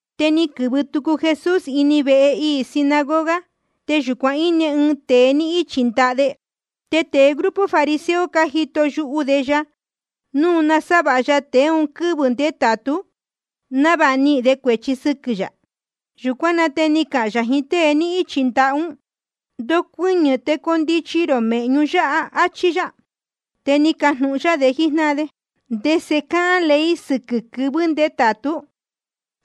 Te ni quɨ̄vɨ tucu Jesús ini vehe iī sinagoga. Te yūcuan íne ɨɨn tēe ni ichī ɨɨn ndaha de. Te tēe grupo fariseo cájito yuhu de ya núu nasávāha ya tēe un quɨ́vɨ̄ ndétātú, návāha nihīn de cuēchi sɨquɨ̄ yā. Yūcuán na te ni cahān yā jiín tée ni ichī ndaha ún: Ndocuɨñɨ̄ te condichi rō mēhñu yáha, áchí yá. Te ni cajnūhun yá de jíjnáhan de: ¿Ndese cáhán ley sɨquɨ̄ quɨvɨ̄ ndétātú?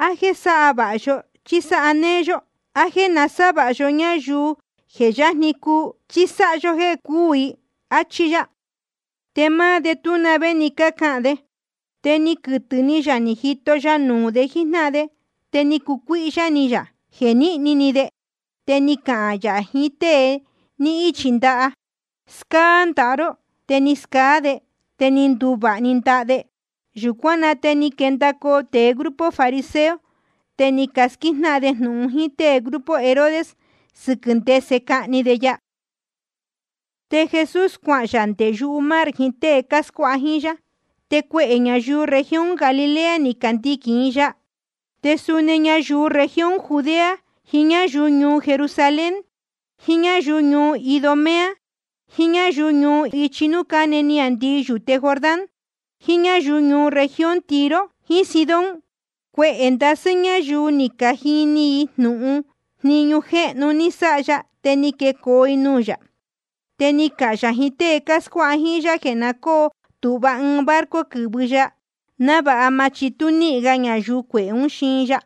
¿A jéē sáha vāha yó, chí sáha néé yó? ¿A jéē nasávāha yó ñáyuu je yajni cuu, chí sáha yó jéē cúū i? áchí yá. Te máá de tú na vé ni cacahān de. Te ni quɨtɨ̄ ni yā ni jito ya nuū de jíjnáhan de, te ni cucuíhyá ni yā jeē níhni ni de. Te ni cahān yā jiín tée ni ichī ndaha: Scáá ndaha ró. Te ni scaá de, te ni nduvāha‑ni ndaha de. Yūcuán na te ni quendacoo tēe grupo fariseo, te ni casquíjnáhan de jnūhun jíín tée grupo Herodes sɨquɨ̄ yā, ndese cahni de ya. Te Jesús cuahān yā nde yumar jiín tée cáscuáha jíín yá. Te cuehē ñayuu región Galilea ni candiquīn i ya. Te suni ñayuu región Judea, jiín ñáyuu ñuu Jerusalén, jiín ñáyuu Idumea, jiín ñáyuu ichi núū cáne niāndii yūte Jordán, jiín ñáyuu región Tiro jiín Sidón, cuehē ndasɨ́ ñáyuu ni cajini jnūhun i jniñu jéhnu ni sáha ya, te ni quecoo i nuū yā. Te ni cahān yā jiín tée cáscuáha jíín yá jeē na cóo tūhva ɨɨn barco quɨ̄vɨ ya, návāha ma chitú níhin ñayuu cuehē ún xiin ya.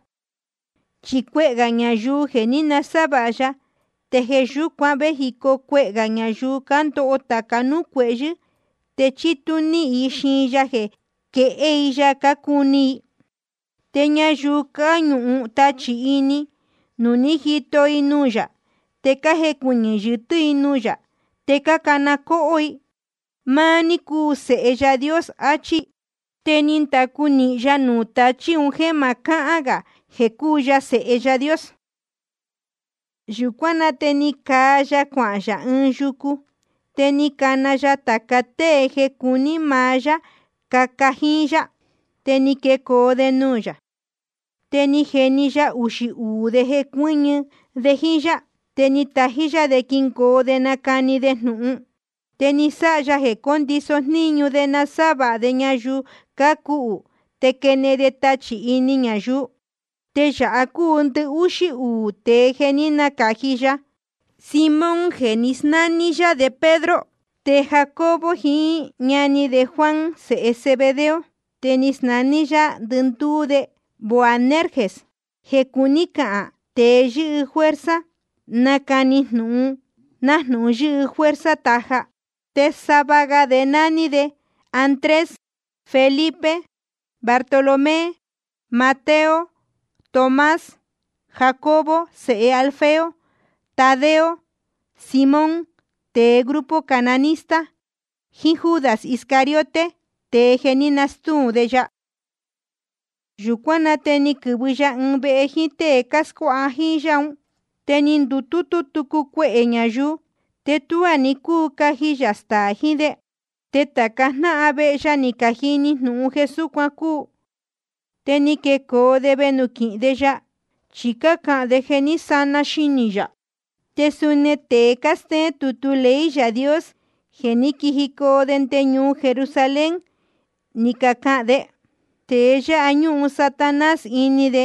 Chi cuehē ñayuu je ni nasávāha ya, te jeē yúcuan vējicoo cuehē gā ñayuu cándoho tāca núū cuehyɨ̄, te chítú níhin i xiin ya jeē quehé i ya cácuni i. Te ñayuu cáñuhun tachī ini, núu ni cajito nuū yā, te cájecuɨñɨ̄ yɨtɨ́ núū yā, te cácana cóhó: Máá ní cúu Sēhe Yaā Dios, achí. Te ni ndacu nīhin ya nuū tachí un jéē ma cáhán gā jeē cúu ya Sēhe Yaā Dios. Yūcuán na te ni caa ya cuahān yā ɨɨn yucu. Te ni cana ya tāca tée jeē cuní maá yá caca jíín yá, te ni quecoo de nuū yā. Te ni jeni ya uxī uū de jeē cuɨ́ñɨ de jíín yá, te tají yá de quingoo de nacani de jnūhun. Te ni sáha ya jeē cóndiso jníñu de nasávāha de ñayuu cuhú te quenehen de tachī ini ñayuu. Te yāha cúu ndɨhúxí uū tēe jeē ní nacāji ya: Simón jeē ní nasnání yá de Pedro. Te Jacobo jiín ñani de Juan, sēhe Zebedeo. Te ni nasnání yá ndɨndúú de Boanerges, jeē cuní cahān: Tēe yɨ́hɨ fuerza nacani jnūhun, nájnūhun yɨ́hɨ fuerza taja. Te sava ga de nání de Andrés, Felipe, Bartolomé, Mateo, Tomás, Jacobo sēhe Alfeo, Tadeo, Simón tēe grupo cananista, jíín Judas Iscariote, tēe jeē ní nastúu de ya. Yūcuán na te ni quɨ̄vɨ ya ɨɨn vehe jíín tée cáscuáha jíín yá un. Te ni ndutútú tucu cuehē ñayuu, te ni tuá ni cúu caji yā staā jiín de. Te tāca jnáhan vehe ya ni cajini jnūhun jeē súcuan cúu. Te ni quecoo de venūquīhin de ya. Chi cácahān de jeē ní sana xinī yā. Te suni tēe cástéén tutu ley Yaā Dios jeē ní quijicoo nde ñuu Jerusalén, ni cacahān de: Tēe yáha ñúhun Satanás ini de,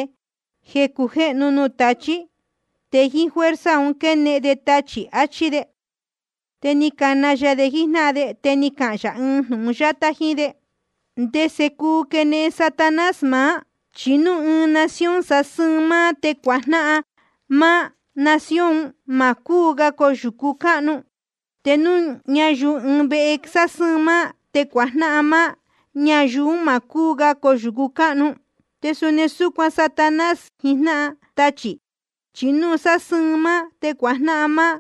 jeē cujéhnu nuū tachí. Te jíín fuerza un quénehen de tachī, achí de. Te ni cana ya de jíjnáhan de, te ni cahān yā ɨɨn jnūhun yátá jíín de: ¿Ndese cuu quenehen Satanás maá? Chi núu ɨɨn nación sásɨ́ɨn máá te cuajnáhan máá, nación un má cúu ga coyūcu cáhnu. Te núu ñayuu ɨɨn vehe sásɨ́ɨn máá te cuajnáhan máá, ñayuu un má cúu ga coyūcu cáhnu. Te suni súcuan Satanás jiín jnáhan tachī, chi núu sásɨ́ɨn máá te cuajnáhan máá,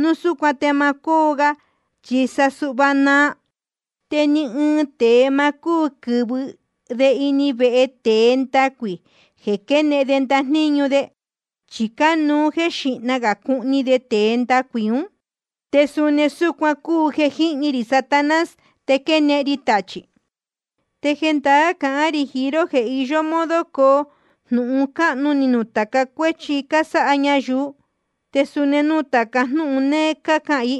núu súcuan te ma cóo ga, chi sa suhva naa. ’Te ni ɨɨn tēe ma cúu quɨ̄vɨ de ini vehe tēe ndacuī jeē quenehen de ndajníñu de. Chi cánuú jeē xíhna gā cuhni de tēe ndacuī ún. Te suni súcuan cúu jeē jíhni rī Satanás te quénehen ri tachī. ’Te jendaá cahán rī jiín ró jeē iyó modo coo jnūhun cáhnu ni nuū tāca cuéchi cásáha ñayuu, te suni nuū tāca jnúhun néé cácahān i.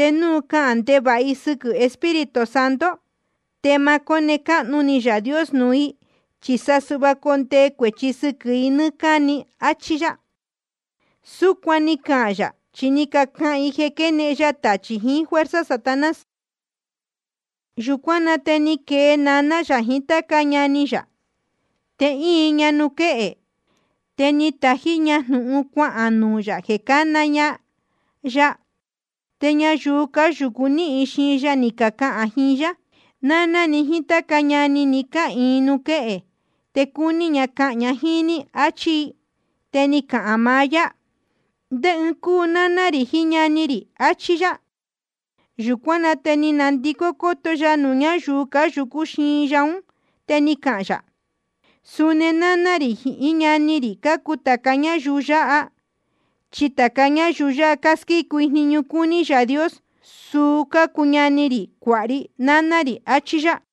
Te núu cahān ndevāha i sɨquɨ̄ Espíritu Santo, te ma cóne cáhnu ni Yaā Dios nuū i, chi sa suhva condee cuēchi sɨquɨ̄ i nɨ́ɨ́ cáni, áchí yá. Súcuan ni cahān yā, chi ni cacahān i jeē quénehen ya tachī jiín fuerza Satanás. Yūcuán na te ni quee naná yā jiín táca ñani yā. Te íin ña nuū quéhe, te ni tají ña jnūhun cuahān nuū yā jeē cána ña ya. Te ñayuu cáyūcu nɨ́ɨ́ xiin ya, ni cacahān i jíín yá: Náná ni jíín táca ñani ni cáhīin nuū quéhe, te cácuni cahān jiín ní, áchí i. Te ni cahān maá yá: ¿Ndé ɨɨn cúu náná rī jiín ñani rī? achí yá. Yūcuán na te ni ndacoto ya nuū ñáyuu cáyūcú xiin ya ún, te ni cahān yā: Suni náná rī jiín ñani rī cácuu tāca ñáyuu yáha. Chi tāca ñáyuu casquícu jniñu cúní Yaā Dios, suu cácuu ñani rī, cuāha ri, náná rī, achí yá.